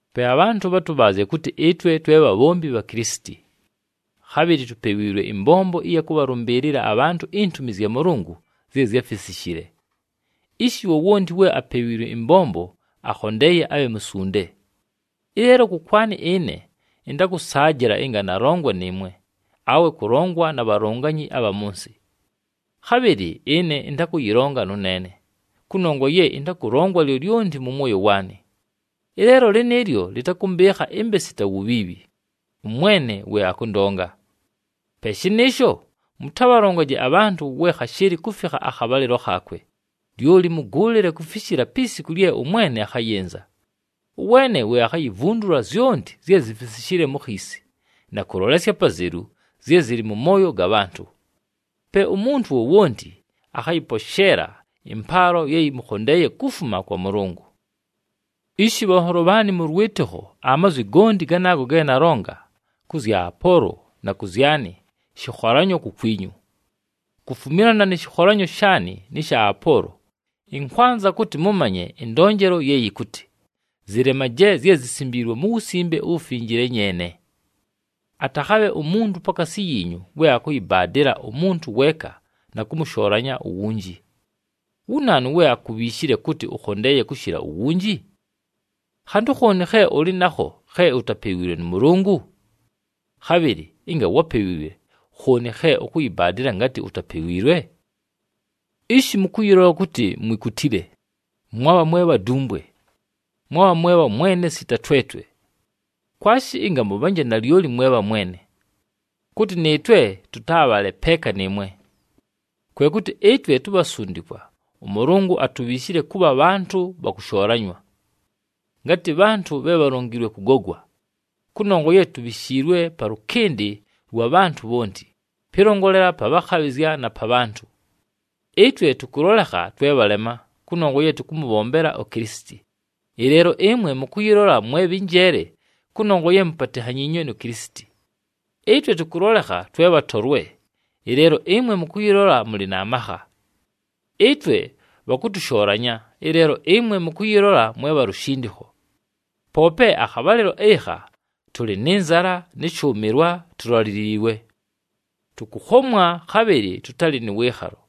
Pe abhantʉ bhatʉbhaazye kʉtɨ ɨtwe twe bhabhombi bha Kilisiti. Khabhɨlɨ tupewiilwe ɨmbombo ɨya kʉbhalʉmbɨɨlɨla abhantʉ intumi zya Mʉlʉngʉ zye zyáfisishile. Ishi, wowonti we apewiilwe ɨmbombo, akhondeeye abhe musunde. Ɨleelo kʉkwanɨ ɨne, ɨntakʉsaajɨla ɨnga nalongwa nɨɨmwe, awe kʉlongwa na bhalonganyi abha mʉ nsɨ. Khabhɨlɨ ɨne ɨntakʉyɨlonga nʉneene, kʉnongwa ye ɨntakʉlongwa lyolyonti mʉ mwoyo waanɨ. Ɨleelo lɨnɨɨlyo lɨtakʉmbɨɨkha ɨmbe sita wubhiibhi, ʉMwene we akʉndonga. Pe shɨnɨɨsho, mʉtabhalongaje abhantʉ we khashɨɨlɨ kufikha akhabhalɨlo khaakwe, lyoli mʉgʉʉlɨle kufishila pi siku lye ʉMwene akhayɨnza. Ʉweene we akhayivundula zyonti zye zifisishile mu khiisi, na kʉlolesya apazelu zye zɨlɨ mʉ mooyo ga bhantʉ. Pe umuntu wowonti akhayɨposheela ɨmpaalo ye yɨmʉkhondeeye kufuma kwa Mʉlʉngʉ. Ishi, bhanholo bhaanɨ mʉ lwɨtɨkho, amazwi gonti ganaago ge nalonga kʉ zya Apoolo na kʉ zyanɨ, shɨkholanyo kukwinyu. Kufumilana nɨ shɨkholanyo shaanɨ nɨ sha Apoolo, ɨnkwanza kʉtɨ mʉmanye ɨndonjelo ye yɨkʉtɨ, “Zɨlemaje zye zisimbiilwe mu Wusimbe uWufinjile nyeene.” Atakhabhe umuntu pakaasi yiinyu we akʉyɨbaadɨla umuntu weeka na kʉmʉshoolanya uwunji. Wu naanu we akubhiishile kʉtɨ ʉkhondeeye kʉshɨla uwunji? Khantʉ khooni khe ʉlɨ nakho khe utapewiilwe nʉ Mʉlʉngʉ? Khabhɨlɨ ɨnga wápewiilwe, khooni khe ʉkʉyɨbaadɨla ngatɨ utapewiilwe? Ishi mʉkʉyɨlola kʉtɨ mwikutile! Mwabha mwe bhadumbwe! Mwabha mwe bhamwene sita twetwe! Kwashi ɨnga mʉbhanje nalyoli mwe bhamwene, kʉtɨ nɨɨtwe tʉtabhaale peeka nɨɨmwe! Kwe kʉtɨ ɨtwe tubhasundikwa, ʉMʉlʉngʉ atubhiishile kʉbha bhantʉ bha kʉshoolanywa. Ngatɨ bhantʉ bhe bhalongiilwe kʉgogwa, kʉnongwa ye tubhishiilwe palʉkɨndɨ lwa bhantʉ bhonti, pɨlongolela pa bhakhabhɨzya na pa bhantʉ. Ɨtwe tʉkʉlolekha twe bhalema, kʉnongwa ye tʉkʉmʉbhombela uKilisiti, ɨleelo ɨmwe mʉkʉyɨlola mwe bhɨ njeele kʉnongwa ye mupatinhanyiinywe nu Kilisiti. Ɨtwe tʉkʉlolekha twe bhatolwe, ɨleelo ɨmwe mʉkʉyɨlola mʉlɨ na makha. Ɨtwe bhakʉtʉshoolanya, ɨleelo ɨmwe mʉkʉyɨlola mwe bha lushindikho. Poope akhabhalɨlo ɨkha, tʉlɨ nɨ nzala nɨ shʉʉmɨlwa, tulaliliilwe. Tʉkʉkhomwa, khabhɨlɨ tʉtalɨ nʉ wɨɨkhalo.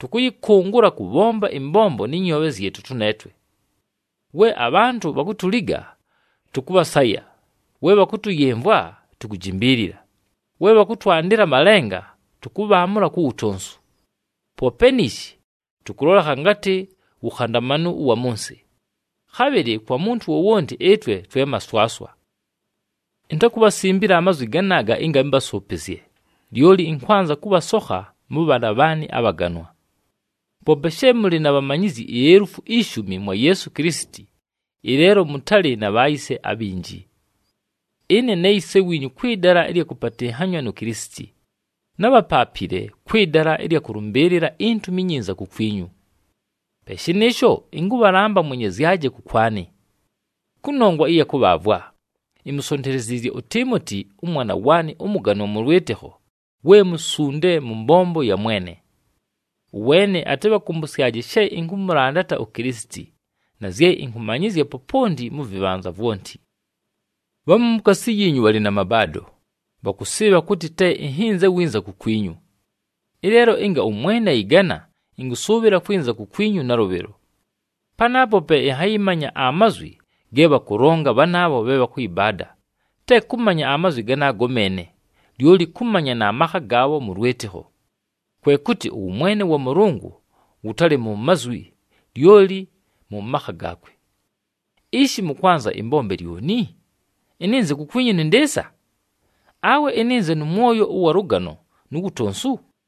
Tʉkʉyɨkʉngʉla kʉbhomba ɨmbombo nɨ nyoobhe zyɨtʉ tʉneetwe. We abhantʉ bhakutuliga, tʉkʉbhasaya, we bhakʉtʉyɨmvwa, tukujimbiilila, we bhakʉtwandɨla amalenga, tʉkʉbhaamʉla ku wutonsu. Poope niishi, tʉkʉlolekha ngatɨ wukhandamanu ʉwa mʉ nsɨ, khabhɨlɨ kwa muntu wowonti ɨtwe twe maswaswa. Intakubhasimbila amazwi ganaaga ɨnga ɨmbasʉʉpɨzye, lyoli ɨnkwanza kʉbhasokha mʉbhaana bhaanɨ abhaganwa. Poope she mʉlɨ na bhamanyizyi ielufu ishumi mwa Yeesu Kilisiti, ɨleelo mʉtalɨ na bhayise abhinji. Ɨne ne yise wiinyu kwɨ dala ɨlya kʉpatɨnhanywa nu Kilisiti, nábhapaapile kwɨ dala ɨlya kʉlʉmbɨɨlɨla iNtumi iNyinza kukwinyu. Pe shɨnɨɨsho, ɨnkʉbhalamba mwenyezyaje kʉkwanɨ. Kʉnongwa ɨya kʉbhaavwa, imusonteleziizye uTiimoti, ʉmwana waanɨ ʉmʉganwa mʉ lwɨtɨkho, we musunde mʉ mbombo ya Mwene. Ʉweene atɨbhakʉmbʉsyaje she ɨnkʉmʉlandata uKilisiti, na zye ɨnkʉmanyɨzya poponti mʉ vɨbhanza vwonti. Bhamu mukaasi yiinyu bhalɨ na mabaado, bhakʉsɨɨbha kʉtɨ te ɨnhɨnze winza kukwinyu. Ɨleelo ɨnga ʉMwene ayɨgana, ɨnkʉsʉʉbhɨla kwɨnza kukwinyu nalʉbhɨlo. Panaapo pe ɨnhayɨmanya amazwi ge bhakʉlonga bhanaabho bhe bhakʉyɨbaada, te kʉmanya amazwi ganaago meene, lyoli kʉmanya na makha gaabho mʉ lwɨtɨkho. Kwe kʉtɨ ʉwʉmwene wa Mʉlʉngʉ, wʉtalɨ mu mazwi, lyoli mʉ makha gaakwe. Ishi, mʉkwanza ɨmbombe lyoni? Ɨnɨnze kukwinyu nɨ ndɨɨsa? Awe ɨnɨnze nʉ mwoyo ʉwa lʉgano nu wutonsu?